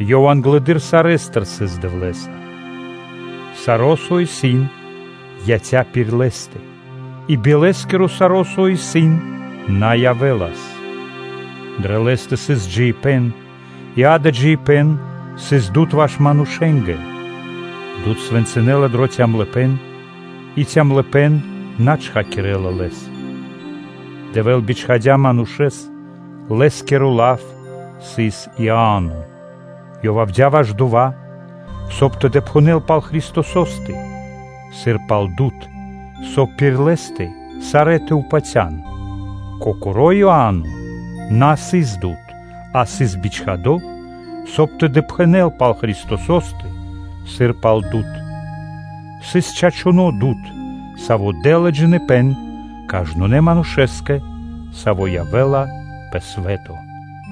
Ёв (Лав) англэды́р сарэ́стыр сыс Дэвлэ́са. Саро́, со исын, яця́ пир Лэ́стэ, и би Лэ́скиро саро́ со исын, на явэ́лас. Дрэ Лэ́стэ сыс джиибэ́н и дава́ джиибэ́н сыс Дуд (Свэ́то) ваш манушэ́нгэ. Дуд свэнцынэла дро калыпэ́н (цемныма/цямлыпэ́н), и калыпэ́н на мурдякирдя лэс. Дэвэ́л бичхадя́ манушэ́с, лэ́скиро лав сыс Иа́но. Ёв явдя́ ваш дова́, соб (кай) тэ допхэнэл пал Христосо́стэ сыр пал Дуд (Свэ́то), соб (кай) пир Лэ́стэ сарэ́ тэ патя́н. Кокоро́ Иа́но на сыс Дуд, а сыс бичхадо́ Дэвлэ́стыр, соб (кай) тэ допхэнэл пал Христосо́стэ сыр пал Дуд. Дава́ сыс чачуно́ Дуд, Саво́ дэ́ла джиныбэ́н кажнонэ́ манушэ́скэ, саво́ явэ́ла пэ свэ́то (лот).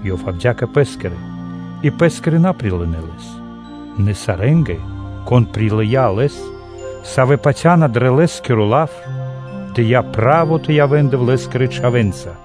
Ёв явдя́ кэ Лэ́скирэ, и Лэ́скирэ на прилынэ́ Лэс. Нэ сарэ́нгэ, кон прилыя́ Лэс, савэ́ патяндынэ́ дрэ Лэ́скиро лав, Ёв дыя́ право тэ явэ́н Дэвлэ́скирэ чхавэ́нца.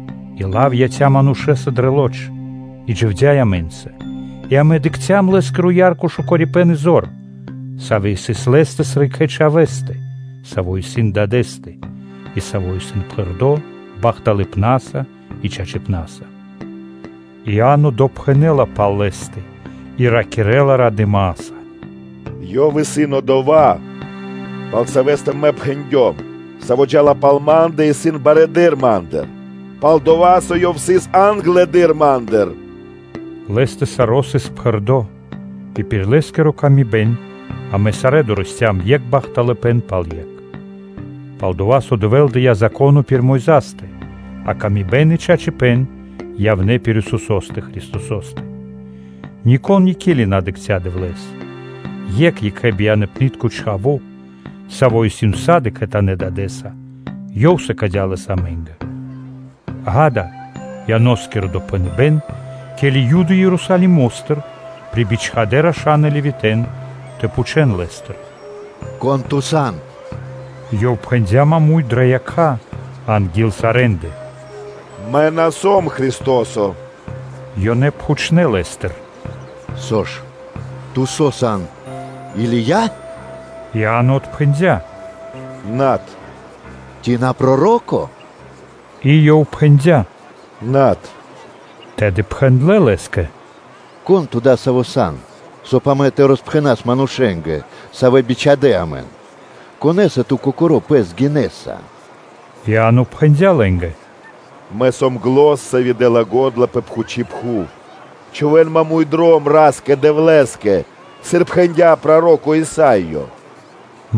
И Лав яця́ манушэ́са дрэ лоч (плоть) и дживдя́ амэ́нца; и амэ дыкхцям Лэ́скиро ярко шукарипэ́н и зор, сави́ сыс Лэ́стэ сыр Екхэбияныпнытконэ Чхавэ́стэ, Саво́ исын Дадэ́стэ, и Саво́ исын пхэрдо́ бахталыпнаса и чачипна́са. Иа́но допхэнэ́ла пал Лэ́стэ и ракирэ́ла радыма́са: “Ёв исын Одова́, пал Савэ́стэ мэ пхэндём: ‘Саво́ джа́ла пал Ма́ндэ, исын барэды́р Ма́ндыр, пал-дова́ со ёв сыс англэды́р Ма́ндыр’” Лэ́стэ саро́ сыс пхэрдо́ и пир Лэ́скиро пхэрдыпэн амэ сарэ́ дорэсцям екх бахталыпэ́н пал екх. Пал-дова́ со Дэвэ́л дыя́ Зако́но пир Мойзастэ (Моисеёстэ), а бахталыпэ́н и чачипэ́н явнэ́ пир Исусо́стэ Христосо́стэ. Нико́н никели на дыкхця́ Дэвлэ́с: Екх Екхэбияныпнытко Чхаво́, Саво́ исын усады/сак (всегда) кхэтанэ́ Дадэ́са, Ёв сыкадя́ Лэс амэ́нгэ. Ѓа́да, исын Ианоскиро допхэныбэ́н, ке́ли Юды Ерусалимо́стыр прибичхадэ раша́н и Левитэ́н тэ пхучэ́н Лэ́стыр: “Кон ту сан?” Ёв пхэндя́ маму́й дро якха́ анги́л сарэ́ндэ: “Мэ на сом Христо́со.” Ёнэ пхучнэ́ лэ́стыр: “Со ж? Ту со сан Или́я?” Иа́но отпхэндя́: “Над.” “Ци на Проро́ко?” И Ёв пхэндя́: “Над.” Тэды пхэндлэ́ лэ́скэ: “Кон ту дасаво сан? Соб (кай) амэ тэ роспхэнас манушэ́нгэ, савэ́ бичхадэ́ амэн, конэса ту кокоро́ пэс гинэса?” Иа́но пхэндя́ лэ́нгэ: “Мэ сом зан, сави́ дэ́ла го́дла пэ чхучи́ пхув: ‘Чхувэ́н маму́й (пря́мо) дром Ра́скэ-Дэвлэ́скэ’ сыр пхэндя́ проро́ко Исаё.’”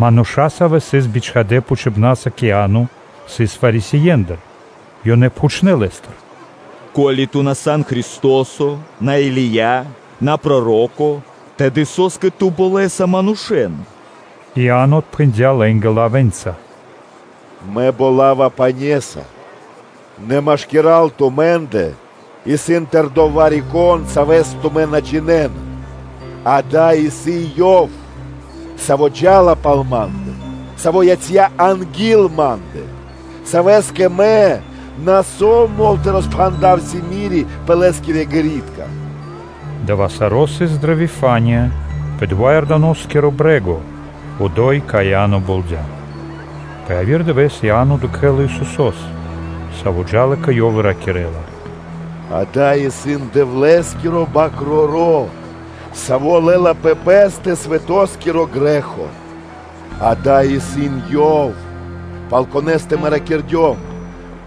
Мануша́, савэ́ сыс бичхадэ́ пхучибнаса кэ Иа́но, сыс Фарисеендыр. Ёнэ пхучнэ́ лэ́стыр: “Со (ко́ли) ту на сан Христо́со, на сан Или́я, на сан Проро́ко, тэды со́скэ ту болэса манушэ́н?” Иа́но отпхэндя́ лэ́нгэ лавэ́нца: “Мэ болава пане́са; нэ машкира́л тумэ́ндэ исын тэрдо́ Вари-Кон, Савэс тумэ́ на джинэ́на. Дава́ исын Ёв, Саво́ джа́ла пал ма́ндэ, Саво́ яця́ анги́л ма́ндэ, Савэ́скэ мэ на сом мол тэ роспхандав симири пэ Лэ́скирэ ґэритка (обув).” Дава́ саро́ сыс дрэ Вифания пэ дова́ Иорданоскиро брэ́го, одо́й, кай Иа́но болдя. Пэ яви́р дывэ́с Иа́но дыкхэ́ла Исусо́с, Саво́ джа́ла кэ ёв и ракирэ́ла: “Ѓа́да, исын Дэвлэ́скиро Свэ́нто Бакроро́, Саво́ лэ́ла пэ Пэ́стэ свэтоскиро грэ́хо. Ѓа́да, исын Ёв, пал Конэ́стэ мэ ракирдём: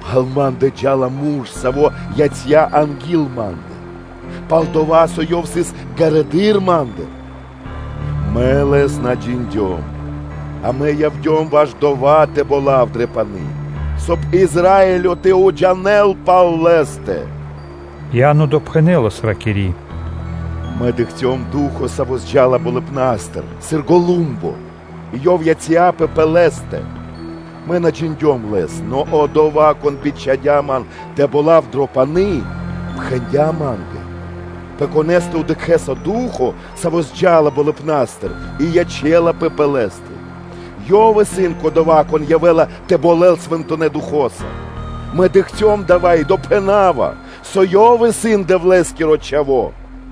“Пал ма́ндэ джа́ла Мурш, Саво́ яця́ анги́л ма́ндэ, пал-дова́, со Ёв сыс ґарэдыр Ма́ндыр.” Мэ Лэс на джиндём, а мэ явдём ваш дова́ тэ болав дрэ пани́, соб (кай) Израилё тэ уджинэл пал Лэ́стэ.” Иа́но допхэнэлас, ракири́: “Мэ дыкхцём Ду́хо (Фа́но), саво́ зджалас болыбна́стыр сыр голумбо, и Ёв яця́пэ пэ Лэ́стэ. Мэ на джиндём Лэс: нэ Одова́, Кон бичхадя́ ман тэ болав дро пани́, пхэндя́ ма́нгэ: “Пэ Конэ́стэ дыкхэ́са Ду́хо (Фа́но), Саво́ явэ́ла тэ джал тэлэ́ болыбна́стыр и ячэ́лапэ пэ Лэ́стэ, Ёв исын Кодова́, Кон явэ́ла тэ болэл Свэнтонэ́ Духо́са.” Мэ дыкхцём дава́ и допхэнава, со Ёв исын Дэвлэ́скиро Чхаво́”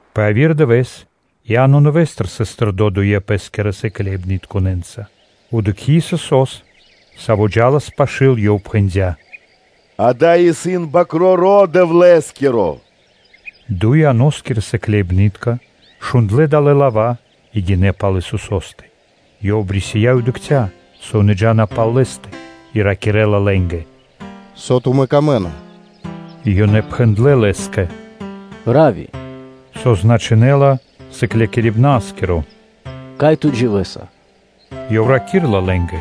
Пэ яви́р дывэ́с Иа́но нэвэ́стыр (нэвэ́с) сыс тэрдо́ дуе Пэ́скирэ сыкляибнытконэ́нца. Дыкхи́ Исусо́с, Саво́ джа́лас пашы́л, ёв пхэндя́: “Ѓа́да, исын Свэ́нто Бакроро́ Дэвлэ́скиро.” Дуй Ианоскирэ сыкляибны́тка шундлэ́ далэ́ лава́ и гинэ́ пал Исусо́стэ. Ёв обрисия и дыкхця́, со ёнэ джа́на пал Лэ́стэ, и ракирэ́ла лэ́нгэ: “Со тумэ́ камэ́на?” Ёнэ пхэндлэ́ Лэ́скэ: “Равви! (со значынэ́ла Сыклякирибна́скиро), кай Ту дживэса?” Ёв раки́рла лэ́нгэ: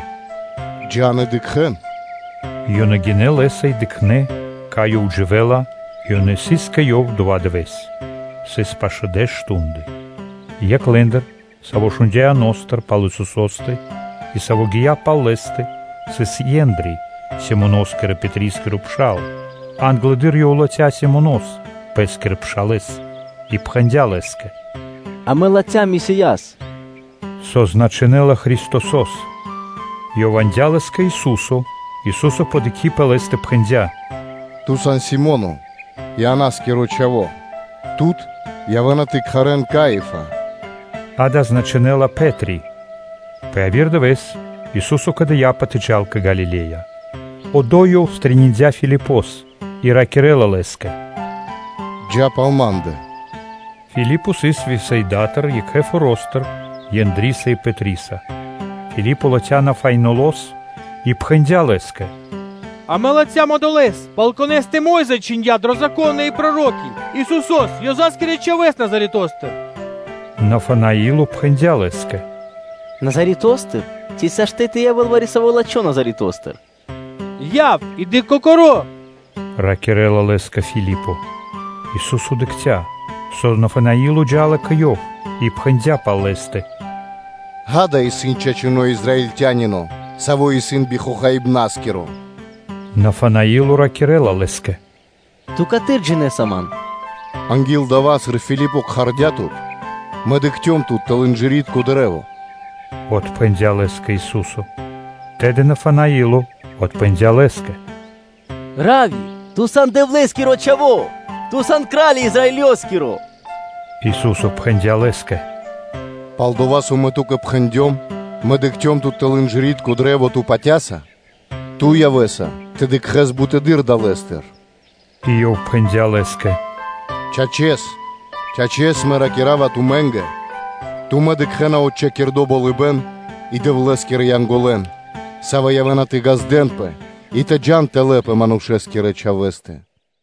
“Джа́н и дыкхэ́н.” Ёнэ гинэ́ Лэ́са и дыкхнэ́, кай Ёв дживэ́ла, и ёнэ сыс кэ Ёв дова́ дывэ́с. Сыс пашэ́ дэш мардэ́ (штунды). Екх лэ́ндыр, саво́ шундя́ Иано́стыр пал Исусо́стэ и саво́ гия́ пал Лэ́стэ сыс о Ендри, Симоноскирэ-Пэтрискиро пшал. Англэды́р ёв латхя́ Симонос, пэ́скирэ пшалэ́с и пхэндя́ лэ́скэ: “Амэ латхям Месияс” /со значынэ́ла Христосо́с/. Ёв яндя́ лэс кэ Ису́со. Ису́со, подыкхи пэ лэ́стэ, пхэндя́: “Ту сан Си́моно, Ианоскиро Чхаво́; тут явэ́на тэ кхарэ́н “Кифа” – дава́ значынэ́ла: бар (Пэ́три). Пэ яви́р дывэ́с Ису́со кэдыяпэ тэ джал кэ Галиле́я. Одо́й Ёв стрэниндя (пирилыя) Филипос и ракирэ́ла лэ́скэ “Джа́ пал Ма́ндэ.” Филипо сыс Вифсаидатыр, екхэ форо́стыр Ендриса и Пэтриса. Филипо латхя́ Нафанаилос и пхэндя́ лэ́скэ: “Амэ латхям Одолэ́с, пал Конэ́стэ Мо́йза чхиндя́ дро Зако́но и проро́ки – Исусо́с, Ёза́скирэ чхавэ́с Назаретостыр.” Нафанаило пхэндя́ лэ́скэ: “Назаретостыр? Ци сашты́ (могинэ́ла) тэ явэ́л вари-со лачхо́ Назаретостыр? Яв и дыкх кокоро́”, – ракирэ́ла лэ́скэ Филипо. Ису́со дыкхця́, со Нафанаило джа́ла кэ Ёв, и пхэндя́ пал лэ́стэ: “Ѓа́да, исын чачуно́ Израильтянино, саво́ исын би хохаибнаскиро.” Нафанаило ракирэ́ла Лэ́скэ: “Ту каты́р джинэ́са ман?” “Анги́л дава́, сыр Филипо кхардя́ тут, Мэ дыкхцём тут тэл инжыритко кашт (дрэ́во)”, – отпхэндя́ лэ́скэ Ису́со. Тэды Нафанаило отпхэндя́ Лэ́скэ: “Равви! Ту сан Дэвлэ́скиро Чхаво́, Ту сан Кра́ли Израилёскиро!” Ису́со пхэндя́ лэ́скэ: “Пал-дова́ со Мэ ту́кэ пхэндём: ‘Мэ дыкхцём тут тэл инжыритко кашт’, ту патя́са? Ту явэ́са тэ дыкхэ́с буты́р далэ́стыр.” И Ёв пхэндя́ лэ́скэ: “Чачэс, чачэс, Мэ ракира́ва тумэ́нгэ: тумэ́ дыкхэ́на отчхакирдо (псирадо) болыбэ́н и Дэвлэ́скирэ Янголэн, савэ́ явэ́на тэ ґаздэ́нпэ кэ Манушэ́скиро Чхаво́ и тэ джа́н тэлэ́ кэ Ёв!”